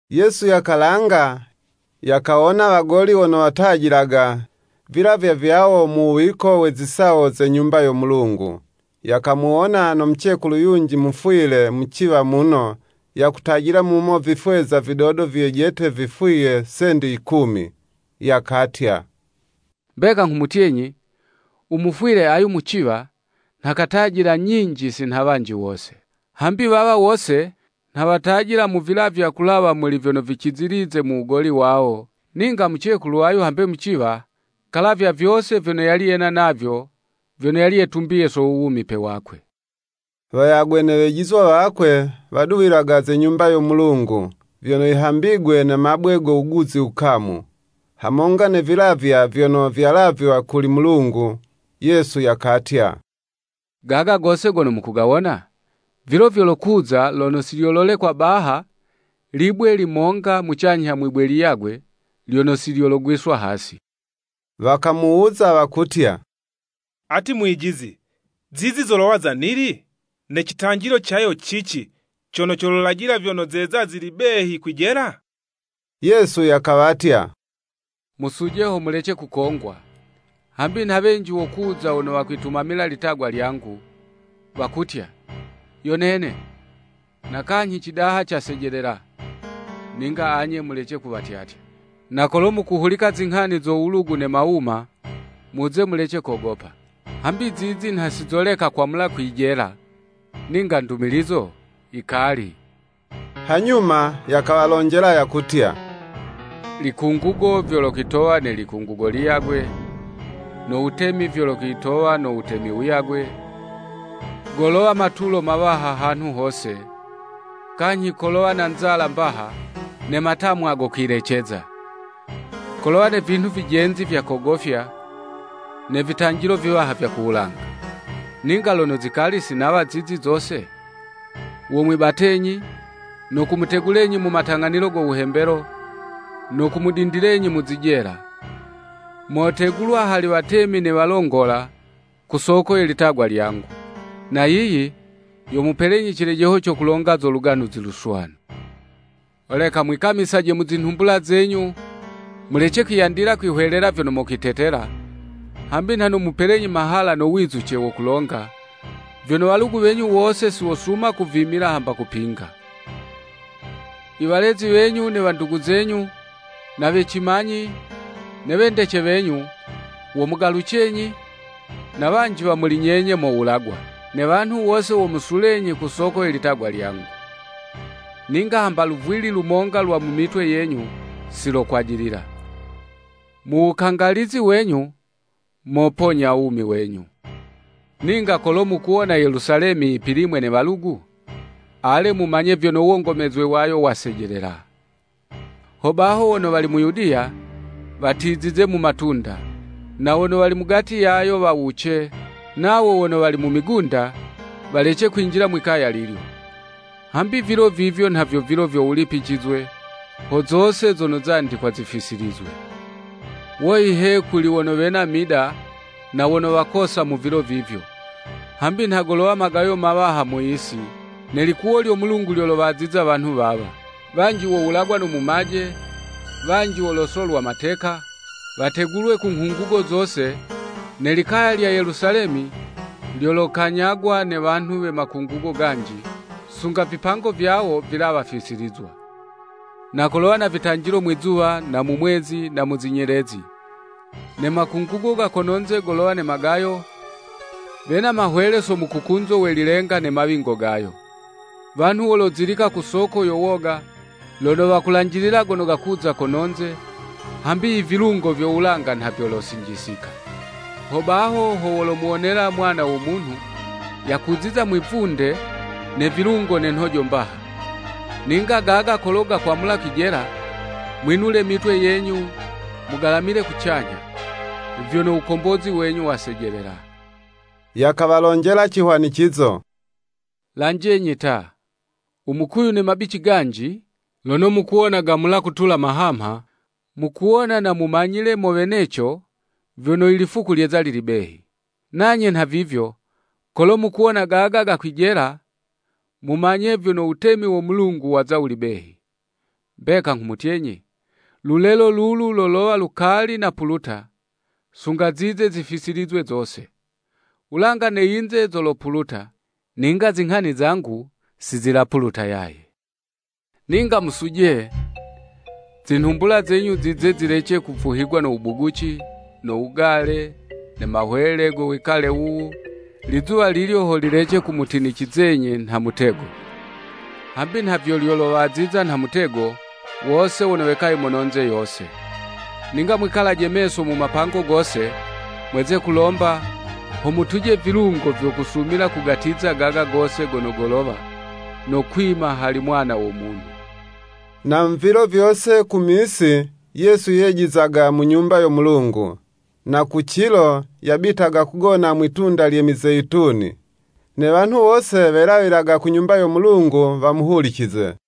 Yesu yakalanga, yakawona wagoli wono watajilaga vilavywa vyawo mu wuwiko we zisawo ze Nyumba yo Mulungu. Yakamuwona no mucekulu yunji mufwile muciwa muno, yakutajila mumo vifweza vidodo vyejete vifwiye sendi ikumi. Yakatya, “Mbeka nghumutyenyi, u mufwile ayu muciwa nha katajila nyinji si nha wanji wose. Hambi wawa wose nha watajila mu vilavywa kulawa muli vyono vicizilize mu wugoli wawo, ninga mucekulu ayu, hambe muciwa, kalavya vyose vyono yali yena navyo, vyono yali yetumbiye so wuwumipe wakwe.” Wayagwe ne wejizwa wakwe, waduwilaga ze Nyumba yo Mulungu, vyono yihambigwe ne mabwe go wuguzi wukamu, hamonga ne vilavywa vyono vyalavywa kuli Mulungu. Yesu yakatya, “Gaga gose gono mukugawona, vilo vyolokuza, lono si lyololekwa baha libwe limonga mucanyha mwi'bwe liyagwe, lyono si lyologwiswa hasi.” Wakamuwuza, wakutya, “Ati Mwijizi, zizi zolowa za nili? Ne citanjilo cayo cici, cono colajila vyono zeza zili behi kwijela?” Yesu yakawatya, “Musuje ho mulece kukongwa, hambi nha wenji wokuza wono wokwitumamila ilitagwa lyangu, wakutya, ‘Yo nene.’ na kanyhi, ‘Cidaha casejelela.’ Ninga anye mulece kuwatyatya! Na kolo mukuhulika zinghani zo wulugu ne mawuma, muze mulece kogopa; hambi zizi nha si zoleka kwamula kwijela; ninga ndumilizo yikali.” Hanyuma yakawalonjela, yakutya, likungugo vyokwitowa ne likungugo liyagwe, no wutemi vyokwitowa no wutemi wuyagwe, golowa matulo mawaha hanhu hose, kanyhi kolowa na nzala mbaha, ne matamwa go kwileceza. Kolowa ne vinhu vijenzi vya kogofya, ne vitanjilo viwaha vya ku wulanga. Ninga lono zikali si nawa zizi zose, womwibatenyi, no kumutegulenyi mu matang'anilo go wuhembelo, no kumudindilenyi mu zijela, motegulwa hali watemi ne walongola, ku soko ye litagwa lyangu. Na yiyi yomupelenyi cilejeho co kulonga zo Luganuzi Luswanu. Holeka mwikamise mu zinhumbula zenyu, mulece kwiyandila kwihwelela vyono mokwitetela, hambi nha nomupelenyi mahala no wizuce wo kulonga, vyono walugu wenyu wose si wosuma kuvimila hamba kupinga. Iwalezi wenyu, ne wandugu zenyu, na we cimanyi, ne wendece wenyu, womugalucenyi, na wanji wa muli nyenye mowulagwa. Ne wanhu wose womusulenyi ku soko ye litagwa lyangu. Ninga hamba luvwili lumonga lwa mu mitwe yenyu, silokwajilila. Mu wukangalizi wenyu, moponya wumi wenyu. “Ninga kolo mukuwona Yelusalemi yipilimwe ne walugu, ale, mumanye vyono wongomezwe wayo wasejelela. Hobaho wono wali mu Yudiya, watizize mu matunda; na wono wali mugati yayo wawuce, nawo wono wali mu migunda, walece kwinjila mwikaya lilyo. Hambi ivilo vivyo nha vyo vilo vyo wulipicizwe, ho zose zono zandikwa zifisilizwe. Woyi he kuli wono wena mida, na wono wakosa mu vilo vivyo! Hambi nha golowa magayo mawaha mu yisi, ne likuwo lyo Mulungu lyowaziza wanhu wawa. Wanji wowulagwa no mumaje, wanji wolosolwa mateka, wategulwe ku nghungugo zose, ne likaya lya Yelusalemi, lyolokanyagwa ne wanhu we makungugo ganji, sunga vipango vyawo vilawa fisilizwa.” “Na kolowa na vitanjilo mwi'zuwa na mu mwezi na mu zinyelezi; ne makungugo kono'nze golowa na magayo, wena mahwele so mukukunzo we lilenga ne mawingo gayo. Wanhu wozilika ku soko yo woga, lono wakulanjilila gono gakuza kono'nze, hambi i vilungo vyo wulanga nha vyolosinjisika. Hobaho ho wolomuwonela Mwana wo Munhu, yakuziza mwivunde ne vilungo ne nhojo mbaha. Ninga gaga kolo gakwamula kwijela, mwinule mitwe yenyu mugalamile kucanyha, vyono wukombozi wenyu wasejelela.” Yakawalonjela cihwanicizo: “Lanjenyi ta, u mukuyu ne mabici ganji, lono mukuwona gamula kutula mahamha, mukuwona na mumanyile mo weneco vyono lifuku lyeza lili behi. Nanye nha vivyo, kolo mukuwona gaga gakwijela, mumanye vyono wutemi wo Mulungu waza wuli behi. Mbeka nghumutyenyi, lulelo lulu lolowa lukali napuluta, sunga zize zifisilizwe zose. Wulanga ne yinze zolopuluta, ninga zinghani zangu si zilapuluta yaye.” “Ninga musuje, zinhumbula zenyu zize zilece kuvuhigwa ko wubuguci, no wugale, ne mahwele go wikale wuwu, lizuwa lilyo ho lilece kumutinicizenyi nha mutego. Hambi nha vyo lyolowaziza nha mutego, wose wono wekaye mono'nze yose. Ninga mwikalaje meso mu mapango gose, mweze kulomba, ho mutuje vilungo vyo kusumila kugatiza gaga gose gono golowa, no kwima hali Mwana wo Munhu.” Na mu vilo vyose ku misi, Yesu yejizaga mu Nyumba yo Mulungu, na ku cilo, yabitaga kugona mwi'tunda lye Mizeyituni. Ne wanhu wose welawilaga ku Nyumba yo Mulungu wamuhulicize.